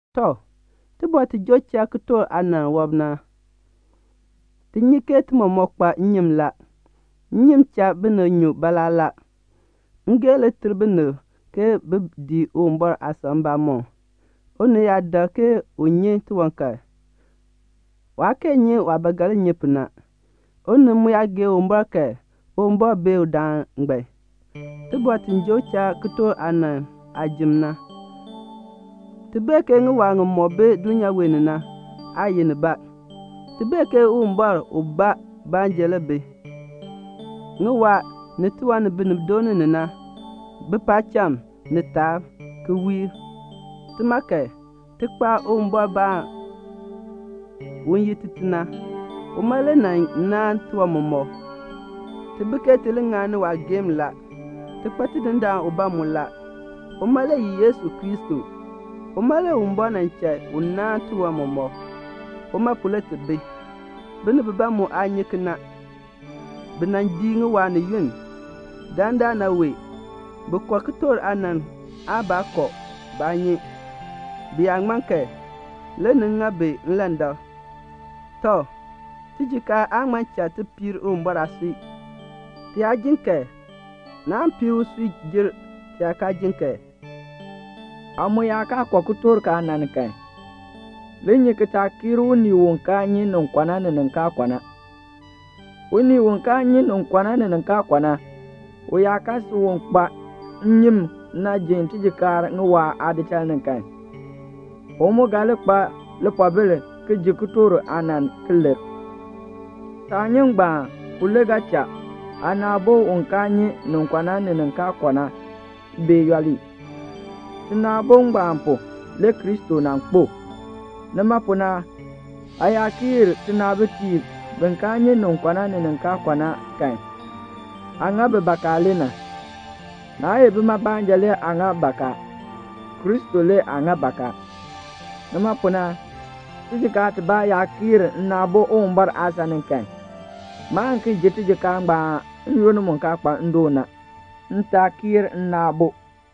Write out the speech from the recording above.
Tɔ, tibɔr ti joo cha kitork aanann aabɔr wɔb na, ti nyi ke ti mɔmɔk kpa nnyim la. Nnyim cha binib nyun baalaa la. Ngeehn le ter binib ke bin dii Uwumbɔr aasan mbamɔm. Unii yaa dak ke u nyi tiwan kan, waa kee nyi waah ba ga li nyi pu na. Unii mu yaa gee Uwumbɔr kan, Uwumbɔr beer udaan ngbaan. Tibɔr ti joo cha kitork aanann aajim na, ti bee ke ŋiwaa ŋimɔk bi dulnyaa wee ni na, aa ye nibaa. Ti bee ke Uwumbɔr ubaa baanja le bi. Ŋiwaa ni tiwan ni binib dooni ni na bi paacham ni taab, ki wiir. Tima kan, ti kpa Uwumbɔrbaan, u ye Tite na. Uma le nan naan tiwan mɔmɔk. Ti bi ke ti li ŋani waageehn la. Ti kpa Tidindaan ubaa mu la. Uma le ye Yesu Kristo. Uma le Uwumbɔr nan cha u naan tiwan mɔmɔk. Uma pu le ti bi. Binib bibaa mu aa nyi kena. Bi nan dii ŋiwaa ni yunn. Dandana wee, bi kɔ kitork aanann aan baa kɔ, baa nyi. Bi yaa ŋman kan, le ni ŋa bi ilandak. Tɔ, tijikaar aan ŋma cha ti piir Uwumbɔr aasui; ti yaa jin kan naan piir usui jer ti yaa kaa jin kan. Aa mu yaa kaa kɔ kitork aanann kan, li nyi ki taa kiir unii u kaa nyi nin kɔ na, ni nin kaa kɔ na. Unii u kaa nyi nin kɔ na ni nin kaa kɔ na, u yaa kan si u kpa nnyim na ji tijikaar ŋiwaa aadichal ni kan, u mu ga li kpa lipoobil ki ji kitork aanann, ki lir. Saanyim ngbaan pu le ga cha aana aabo u kaa nyi nin kɔ na ni nin kaa kɔ na bee yooli. Tina aabo ngbaan pu, le Kristo nan kpo. Nima pu na aa yaa kiir tinaabitiib bi kaa nyi nin kɔ na ni nin kaa kɔ na kan, aa ŋa bi bakaa le na. Naa ye bima baanja le aa ŋa bakaa, Kristo le aa ŋa bakaa. Nima pu na, tijikaar tibaa yaa kiir nna aabo Uwumbɔr aasan ni kan, maan ki ji tijikaar ngbaan n-yoonn mu kaa kpa ndoon na, m taa kiir nna aabo.